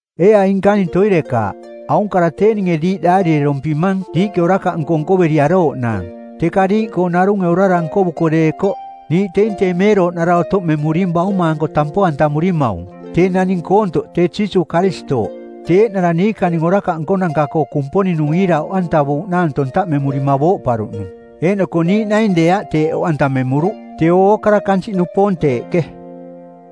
Ee aing nkaning toirekaaꞌ, aung kara tee ninge diiꞌ daarirerompimang diiꞌke orakaꞌnko nkoveriarooꞌnaang, teka diiꞌkoo narunge orara nkovuko deekoꞌ, niiꞌ teing tee meerooꞌnara otoꞌmemuring Bauma-anko tampo-antamurimaung, tee naning koontoꞌ tee Jiisuuꞌ Karistooꞌ. Tee eeꞌnara niikaning orakaꞌ nkonanka-koo Kumponing-nung iira oꞌantavuuꞌnaang tontaꞌmemurima booꞌparuꞌnung. Eeꞌnoko niiꞌ naing deeaꞌ teeꞌ oꞌantamemuruꞌ, teeo ookara kansiꞌnupoong teeꞌke.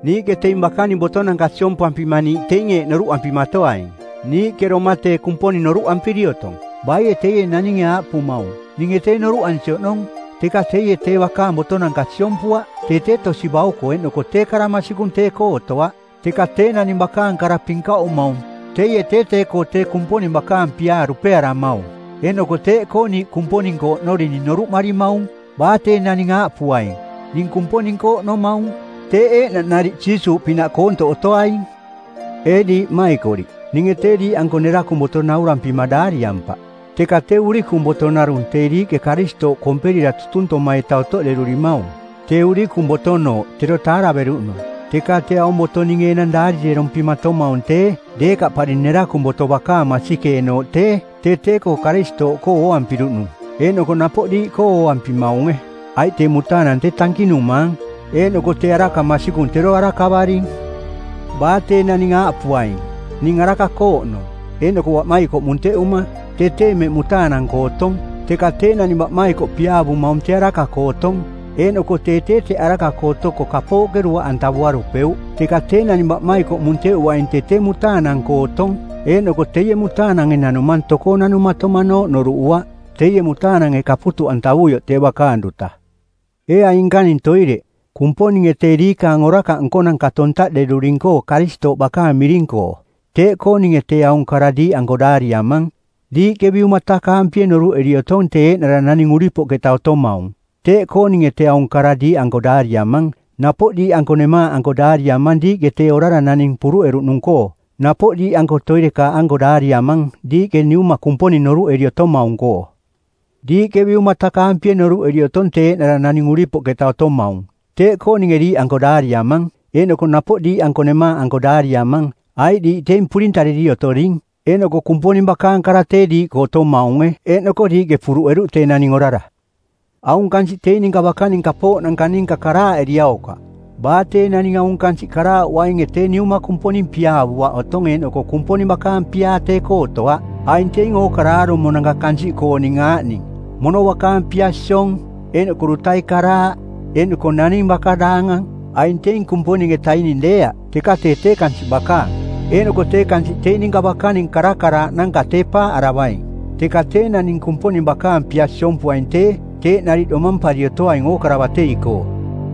Niiꞌke teing bakaning botonanka siompampima niiꞌ teing eeꞌ noruꞌampimatoaing: Niiꞌke doma tee Kumponing noruꞌampiri otong. Baie teie naninge aaꞌpumaung, “Ninge tee noruꞌansi oꞌnong,” teka teie tee bakaang botonanka siompuaꞌ, tee tee tosi-bauko eeꞌnoko tee kara masikung tee-koo otoaꞌ. Teka tee naning bakaang kara pinkaꞌumaung, teie tee tee-koo tee Kumponing bakaang piaa dupearamaung. Eeꞌnoko teeꞌkoo niiꞌ Kumponing-koo oꞌnorining noruꞌmarimaung. Baa tee naning aaꞌpuaing, “Ning Kumponing-koo oꞌnomaung,” teeꞌ eeꞌnaꞌ nariꞌ Jiisuuꞌpinaꞌ koontoꞌ otoaing. Ee diiꞌ mmaikoriꞌ, ninge tee diiꞌanko nerakung boto naurampima daariampaꞌ, teka tee urikung boto narung tee diiꞌke Karistooꞌ komperira tutuntoma-ita otoꞌderurimaung, tee urikung botonooꞌ tero tareveruꞌnung. Teka tee aung boto ninge enang daarirerompimatomaung tee deekaꞌpari nerakung boto bakaang masikeenooꞌ tee tee tee-koo Karistooꞌkoo ooampiruꞌnung eeꞌnoko napoꞌ diiꞌkoo ooampimaunge. Aiꞌ tee mutaanang tee tankinumaang eeꞌnoko tee araka masikung tero arakavaring. Baa tee naning aaꞌpuaing, “Ning araka-koo oꞌnong,” eeꞌnoko baꞌmaikoꞌ munteꞌuma, tee tee mmeꞌ mutaanang-koo otong. Teka tee naning baꞌmaikoꞌ piaavumaung tee araka-koo otong, eeꞌnoko tee tee teꞌ araka-koo otoko kapooꞌke duaꞌantavuarupeuꞌ. Teka tee naning baꞌmaikoꞌ munteꞌuaing tee tee mutaanang-koo otong, eeꞌnoko teie mutaanange nanumang tokoo nanumatomanooꞌ noruꞌuaꞌ, teie mutaanange kaputuꞌantavuioꞌ tee bakaang duta. Ee aing nkaning toireꞌ, Kumponinge tee diikaang orakaꞌ nkonanka tontaꞌderuring-koo Karistooꞌ bakaang miring-koo; teeꞌkoo ninge tee aung kara diiꞌanko daariamang. Diiꞌke biumatakaampie noruꞌeri otong tee eeꞌnara naning uripoꞌketa otomaung. Teeꞌkoo ninge tee aung kara diiꞌanko daariamang. Napoꞌ diiꞌanko nemaaꞌanko daariamang diiꞌke tee orara naning puruꞌeruꞌnung-koo. Napoꞌ diiꞌanko toirekaaꞌanko daariamang, diiꞌke Niuma Kumponing noruꞌeri otomaung-koo. Diiꞌke biumatakaampie noruꞌeri otong tee eeꞌnara naning uripoꞌketa otomaung; teeꞌkoo ninge diiꞌanko daariamang. Eeꞌnoko napoꞌ diiꞌanko nemaaꞌanko daariamang, aiꞌ diiꞌ teing purintariri otoring, eeꞌnoko Kumponing bakaang kara tee diiꞌkoo otomaunge eeꞌnoko diiꞌke puruꞌeruꞌ tee naning orara. Aung kansiꞌ teing ninka bakaning kapooꞌnanka ninka karaaꞌeriaukaꞌ. Baa tee naning aung kansiꞌ karaaꞌuainge tee Niuma Kumponing piaavuaꞌ otong eeꞌnoko Kumponing bakaang piaa tee-koo otoaꞌ. Aing teing ookara aarumonanka kansiꞌkooning aaꞌning: mono bakaang pia siong eeꞌnoko dutai karaaꞌ eeꞌnoko naning baka daangang. Aing teing Kumponing-etaining deeaꞌ, teka tee tee kansiꞌ bakaang. Eeꞌnoko tee kansiꞌ teing ninka bakaning karakaraaꞌnanka tee paaꞌaravaing, teka tee naning Kumponing bakaang pia siompuaing tee, teeꞌ nariꞌ domampari otoaing ookara batei-koo.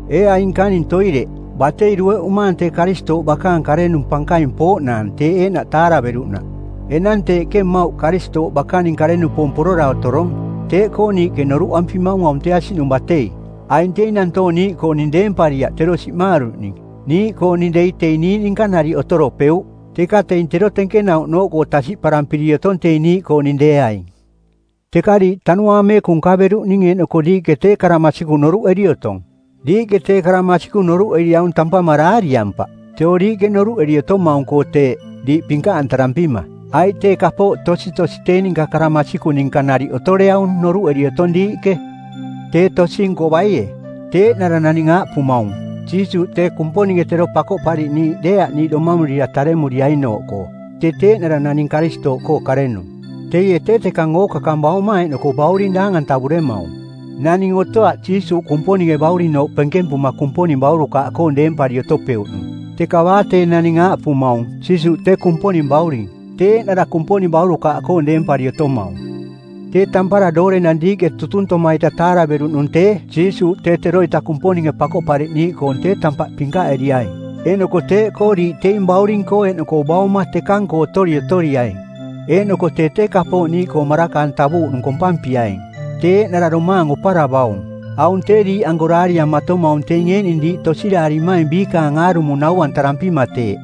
Ee aing nkaning toireꞌ, batei dueꞌumaang tee Karistooꞌ bakaang karenung pankaing pooꞌnaang teeꞌ eeꞌnaꞌ taaraveruꞌnaꞌ. Enang teeꞌke mmauꞌ Karistooꞌ bakaning kare-nupoong porora otorong. Teeꞌkoo niiꞌke noruꞌampimaung aung tee asiꞌnung batei. Aing teing nantoong niiꞌkooning deempariaꞌ tero siꞌmaaruꞌning. Niiꞌkooning dei teing niiꞌ ninka nariꞌ otoropeuꞌ, teka teing tero tenkenauꞌnooꞌkoo tasiꞌparampiri otong teing niiꞌkooning deeaing. Teka diiꞌ Tanuaang Meekung nkaveruꞌning eeꞌnoko diiꞌke tee kara masikung noruꞌeri otong. Diiꞌke tee kara masikung noruꞌeriaung tampama daariampaꞌ, teeo diiꞌke noruꞌeri otomaung-koo teeꞌ, diiꞌ pinkaꞌantarampima, aiꞌ tee kapooꞌ tositosi tee ninka kara masikung ninka nariꞌ otoreaung noruꞌeri otong diiꞌke. Tee tosi-nko baie? Tee eeꞌnara naning aaꞌpumaung, “Jiisuuꞌ tee Kumponinge Tero Pakoꞌpariꞌniiꞌ deeaꞌ niiꞌ domamurira taremurianooꞌkoo.” Tee tee eeꞌnara naning Karistooꞌkoo karenung. Teie tee tekang ookakang Bauma eeꞌnoko Bauring daang-antavuremaung. Naning otoaꞌ Jiisuuꞌ Kumponinge Baurinooꞌ penkempuma Kumponing baurukaaꞌkoong deempari otopeuꞌnung, teka baa tee naning aaꞌpumaung, “Jiisuuꞌ tee Kumponing Bauring,” tee eeꞌnara Kumponing baurukaaꞌkoong deempari otomaung. Tee tampara doorenang diiꞌke tutuntoma-ita taaraveruꞌnung tee Jiisuuꞌ tee teroita Kumponinge Pakoꞌpariꞌniiꞌkoong tee tampaꞌ pinkaꞌeriaing eeꞌnoko teeꞌkoo diiꞌ teing Bauring-koo eeꞌnoko Bauma tekang-koo otori otoriaing. Eeꞌnoko tee tee kapooꞌ niiꞌkoo maraka-antavuuꞌnung kompampiaing, tee eeꞌnara domaang oparavaung. Aung tee diiꞌanko daariamatomaung teing eeꞌning diiꞌ tosiraarimaing biikaning aarumo nau-antarampima teeꞌ.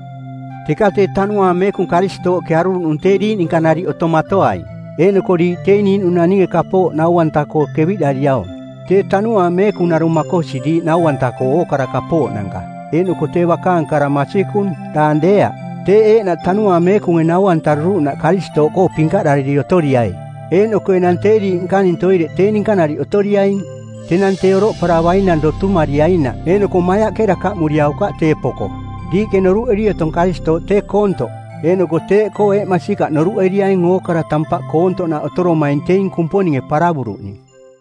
Teka tee Tanuaang Meekung Karistooꞌke aruruꞌnung tee diiꞌ ninka nariꞌ otomatoaing, eeꞌnoko diiꞌ teing niiꞌnung naninge kapooꞌ nau-anta-koo keviꞌdariaung. Tee Tanuaang Meekung narung makosi diiꞌ nau-anta-koo ookara kapooꞌnanka eeꞌnoko tee bakaang kara masikung, daang deeaꞌ. Teeꞌ eeꞌnaꞌ Tanuaang Meekunge nau-antaruruꞌnaꞌ Karistooꞌkoo pinkaꞌdariri otoriai. Eeꞌnoko enang tee diiꞌ nkaning toireꞌ tee ninka nariꞌ otoriaing, tenang tee oroꞌparavainang dotumariainaꞌ eeꞌnoko maiaꞌke dakaꞌmuriaukaꞌ tee poko. Diiꞌke noruꞌeri otong Karistooꞌ tee koontoꞌ eeꞌnoko teeꞌkoo eeꞌ masikaꞌ noruꞌeriaing ookara tampaꞌ koontoꞌnaꞌ otoromaing teing Kumponinge paravuruꞌning.